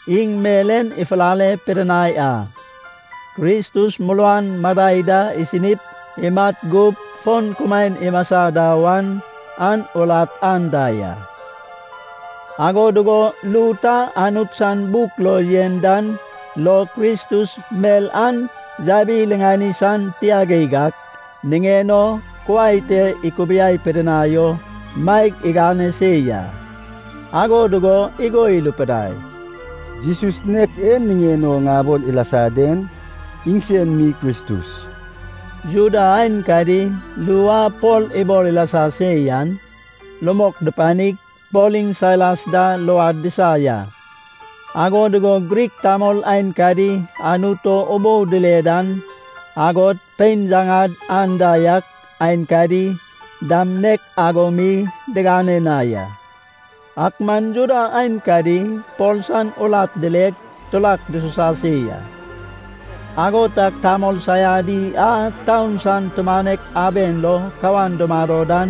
Iŋ mel en ifulale pidinai a, Kristus muruan madai da isinip imat gup fon kumaen imasa da wan an urat anda ya, ago dugo ru ta Anut san buk lo yen dan lo Kristus mel an yabi-riŋani san tia geig ak niŋen o kuai te ikubiai pidinai o maeg igane se ya. Ago dugo igo irupidai, “Jesus nek e niŋen o ŋabol ilasa den iŋsen mi Kristus.” Juda aenkadi ru a Pol ibol ilasa se yan rumok dupanig Pol iŋ Sailas da luad disa ya. Ago dugo Grik tamol aenkadi Anut o ubou dile dan, agod pein yaŋad anda yak aenkadi dam nek ago mi digane na ya. Ak man Juda aenkadi Pol san urat dileg, turak dususa se ya. Ago tag tamol saiadi a taun san tumanek aben lo kawan dumado dan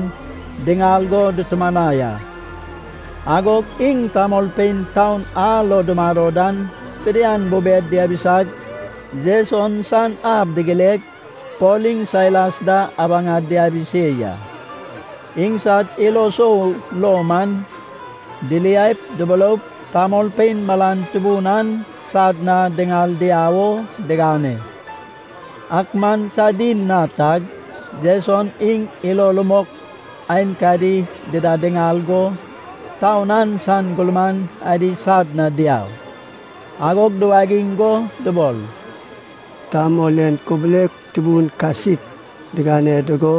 diŋal go dutumanai a. Agog iŋ tamolpein taun a lo dumado dan fidian bubed diabisag, Jeson san ab digileg, Pol iŋ Sailas da abaŋad diabi se ya. Iŋsad ilo sou lo man diliaip duburoup, tamolpein malan tubun an sad na diŋal diau o digane. Ak man ta dil na tag Jeson iŋ ilo rumok aenkadi dida diŋal go taun an san gurman adi sad na diau. Agog duwagiŋ go dubol, “Tamol en kubulek tubun kasik digane dugo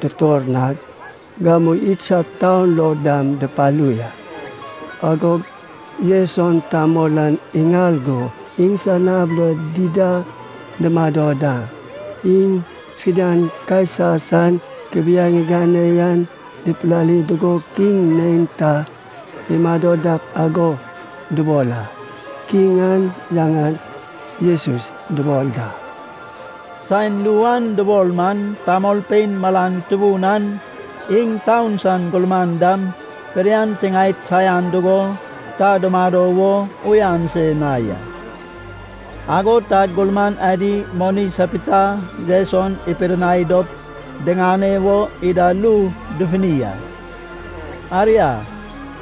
dutor nag, gamu idsad taun lo dam dupalu ya. Agog Jeson tamol an iŋal go iŋsan ab lo dida dumado da. Iŋ fidian Kaisa san kubiaeŋ igane yan dipilali dugo, kiŋ neinta imado dak ago dubol a. Kiŋ an yaŋan Jesus dubol da.” Saen ru an dubol man tamolpein malan tubun an, iŋ taun san gurman dam fidian tiŋaed saian dugo ta dumado wo uyan se na ya. Ago tag gurman adi moni sapita Jeson ipidinai dop diŋane wo ida ru dufuni a. Aria,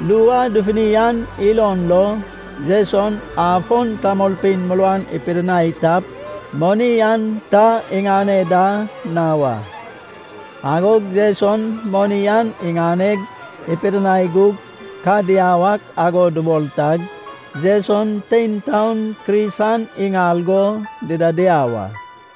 ru a dufuni an ilon lo, Jeson afon tamolpein muruan ipidinai tap, moni an ta iŋane da na wa. Agog Jeson moni an iŋaneg ipidinai gug, ka diau ak ago dubol tag, Jeson tein taon Kris an iŋal go dida diau a.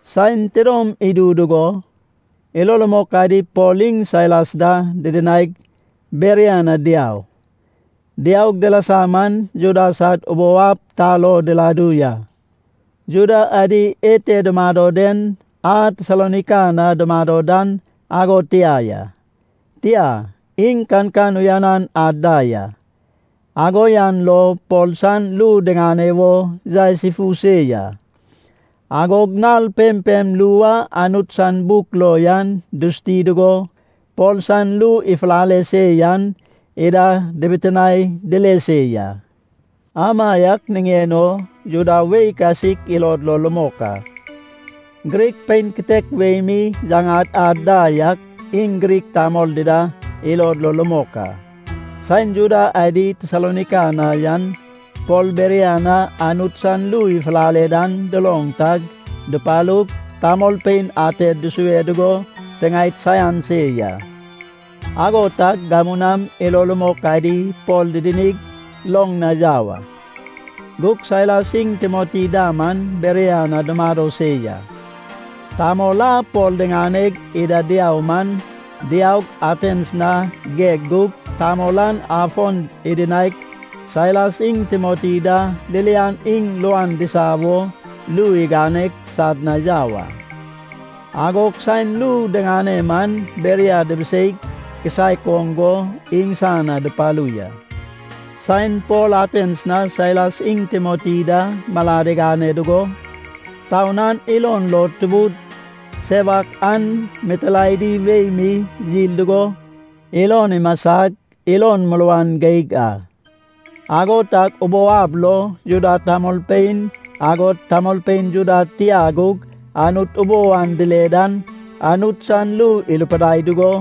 Saen tidom idu dugo, ilo rumok adi Pol iŋ Sailas da didinaig, Beria na diau. Diaug dilasa man Juda sad ubou ab ta lo diladu ya. Juda adi ete dumado den a Tesalonaika na dumado dan ago tia ya, tia, iŋ kankan uyanan ad da ya. Ago yan lo Pol san ru diŋane wo yaes ifu se ya. Agod nal pempem ru a Anut san buk lo yan dusuti dugo Pol san ru ifulale se yan ida dibitinae dile se ya. Amaiak niŋen o Juda wei kasik ilod lo rumok a. Grik pein kitek wei mi yaŋad ad da yak, iŋ Grik tamol dida ilod lo rumok a. Saen Juda adi Tesalonaika na yan Pol Beria na Anut san ru ifulale dan duloŋ tag dupalug, tamolpein ated dusue dugo tiŋaed saian se ya. Ago tag gamu nam ilo rumok adi Pol didinig, loŋ na yau a. Gug Sailas iŋ Timoti da man Beria na dumado se ya. Tamol a Pol diŋaneg ida diau man diaug, Atens na geg gug tamol an afon idinaig Sailas iŋ Timoti da ririan iŋ luan disa wo ru iganeg sad na yau a. Agog saen ru diŋane man Beria dibisei kisaek oŋ go iŋsan na dupalu ya. Saen Pol Atens na Sailas iŋ Timoti da malad igane dugo, taun an ilon lo tubud sewak an mitilaedi wei mi yil dugo, ilon imasag ilon muruan geig a. Ago tag ubou ab lo Juda tamolpein, agod tamolpein Juda tia gug Anut ubou an dile dan Anut san ru irupidai dugo,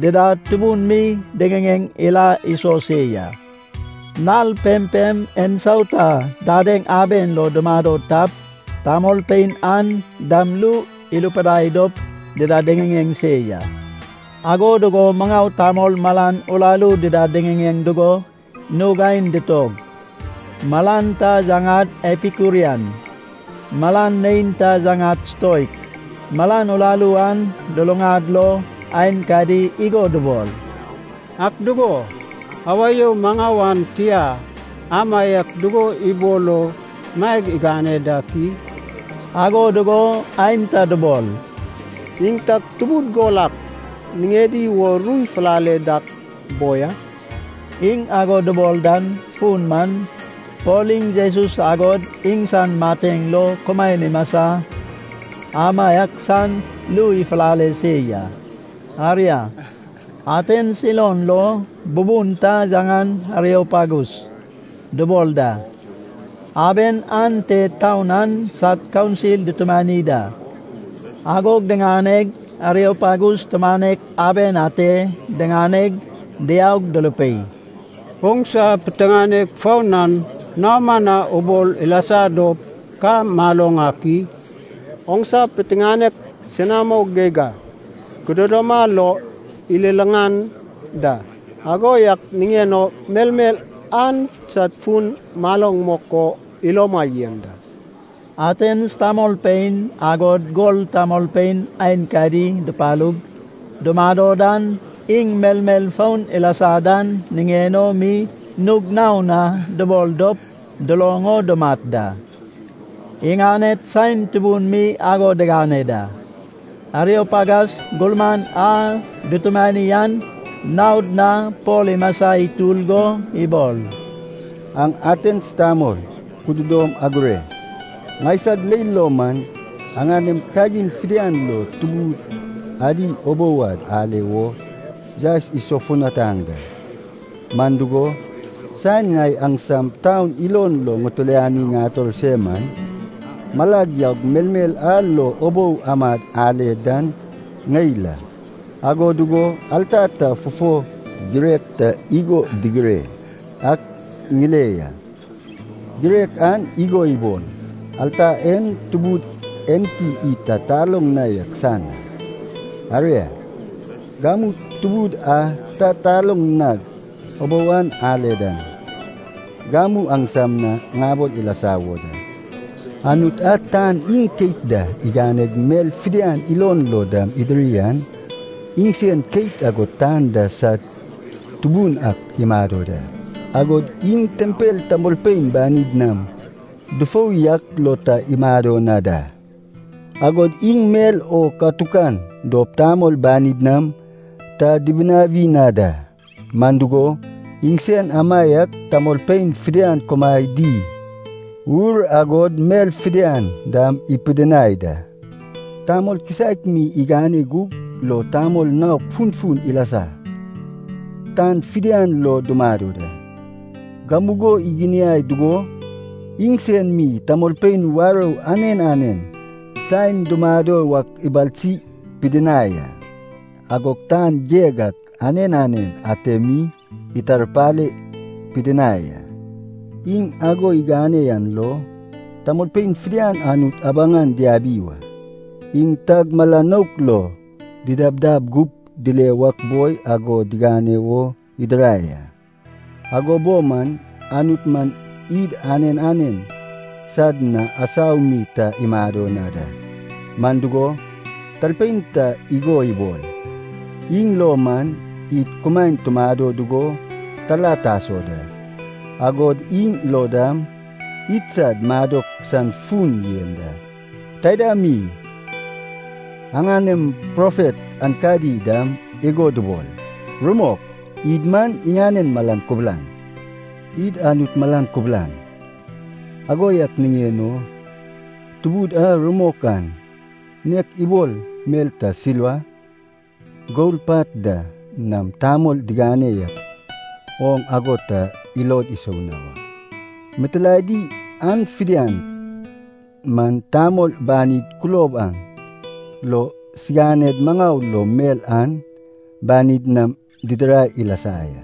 dida tubun mi diŋiŋeŋ ila iso se ya. Nal pempem ensauta dadeŋ aben lo dumado tap, tamolpein an dam ru irupidai dop dida diŋiŋeŋ se ya. Ago dugo maŋau tamol malan uraru dida diŋiŋeŋ dugo nug aen ditog. Malan ta yaŋad Epikurian, malan neinta yaŋad Stoik. Malan uraru an luluŋad lo aenkadi igo dubol, “Ak dugo, awa you maŋau an tia amaiak dugo ibol o maeg igane dak i?” Ago dugo aenta dubol, “Iŋ tag tubud gol ak niŋedi wo ru ifulale dak boi a.” Iŋ ago dubol dan fun man, Pol iŋ Jesus agod iŋsan mateŋ lo kumaen imasa amaiak san ru ifulale se ya. Aria, Atens ilon lo bubun ta yaŋan Ariopagus dubol da. Aben ante taun an sad kaunsil dutumani da. Agog diŋaneg Ariopagus tumanek aben ate diŋaneg diaug durupei, “Oŋsa piteŋanek foun an naoma na ubol ilasa dop ka maloŋ ak i? Oŋsa piteŋanek senamo geig ak kududoma lo ililaŋan da. Ago yak niŋen o melmel an sad fun maloŋ mok o iloma yen da.” Atens tamolpein, agod gol tamolpein aenkadi dupalug dumado dan iŋ melmel foun ilasa dan niŋen o mi nug naon na dubol dop duloŋ o dumat da. Iŋaned saen tubun mi ago digane da. Ariopagas gurman a dutumani an naod na Pol imasa itur go ibol, “Aŋ Atens tamol kududom agure. Ŋaisag leil lo man, aŋanem kagin fidian lo tubud adi ubou ad ale wo yaes isofutanaŋ da. Man dugo, saen ŋai aŋsam taun ilon lo ŋitiliani ŋator se man, malag yaug melmel a lo ubou amad ale dan ŋeil a. Ago dugo alta ta fufo girek ta igo digire yak ŋile ya. Girek an igo ya, ‘Alta en tubud enti id ta taloŋ na yak san a.’ Aria, gamu tubud a ta aloŋ nag ubou an ale dan, gamu aŋsam na ŋabol ilasa wo da. Anut a tan iŋ keit da iganeg mel fidian ilon lo dam idiri an, iŋsen keit agod tan da sad Tubun ak imado da. Agod iŋ tempel tamolpein banid nam dufou yak lo ta imado na da. Agod iŋ mel o katukan dop tamol banid nam ta dibinawi na da. Man dugo, iŋsen amaiak tamolpein fidian kumaen di ur, agod mel fidian dam ipidinai da. Tamol kisaek mi igane gug lo tamol naok funfun ilasag, tan fidian lo dumado da. Gamugo iginiai dugo, iŋsen mi tamolpein warou anen anen saen dumado wak ibalsi pidinai a. Agog tan geg ak anen anen ate mi itarpale pidinai a. Iŋ ago igane yan lo, tamolpein fidian Anut abaŋan diabi wa. Iŋ tag mala nouk lo didabdab gup dile wak boi ago digane wo idirai a. Ago bo man Anut man id anen anen sad na asau mi ta imado na da. Man dugo, talpein ta igo ibol, ‘Iŋ lo man, id kumaen tumado dugo tala taso da, agod iŋ lo dam idsad madok san fun yen da.’ Taida mi, aŋanem profet aenkadi dam igo dubol, ‘Rumok, id man iŋanen malan kubulan.’ Id Anut malan kubulan, ago yak niŋen o Tubud a rumok an nek ibol mel ta silva, gol pat da nam tamol digane yak oŋ ago ta ilod isou na wa. Mitilaedi an fidian man tamol banid kulob an lo siganed maŋau lo mel an banid nam didirai ilasa ya.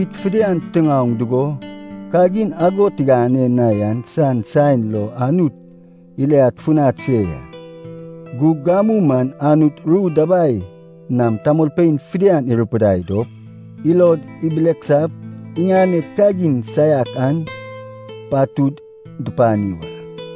Id fidian tiŋaoŋ dugo kagin ago tigane na yan san saen lo Anut iliad funad se ya. Gug gamu man Anut ru dabai nam tamolpein fidian irupidai dop, ilod ibileksap iŋaned kagin saiak an patud dupani wa.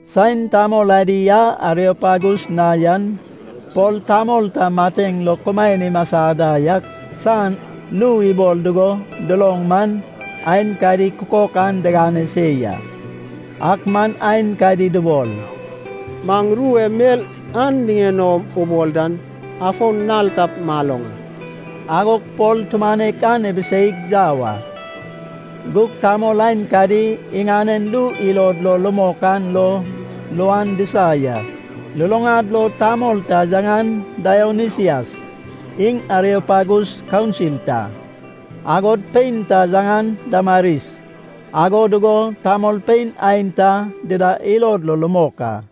Saen tamol adi a Ariopagus na yan Pol tamol ta mateŋ lo kumaen imasa da yak san ru ibol dugo duloŋ man, aenkadi kukok an digane se ya, ak man aenkadi dubol, “Maŋ ru e mel an niŋen o ubol den afon nal tap maloŋ a.” Agog Pol tumanek an ibiseig yau a. Gug tamol aenkadi iŋanen ru ilod lo rumok an lo luan disa ya. Luluŋad lo tamol ta yaŋan Daionisias iŋ Ariopagus kaunsil ta. Agod pein ta yaŋan Damaris, ago dugo tamolpein aenta dida ilod lo rumok a.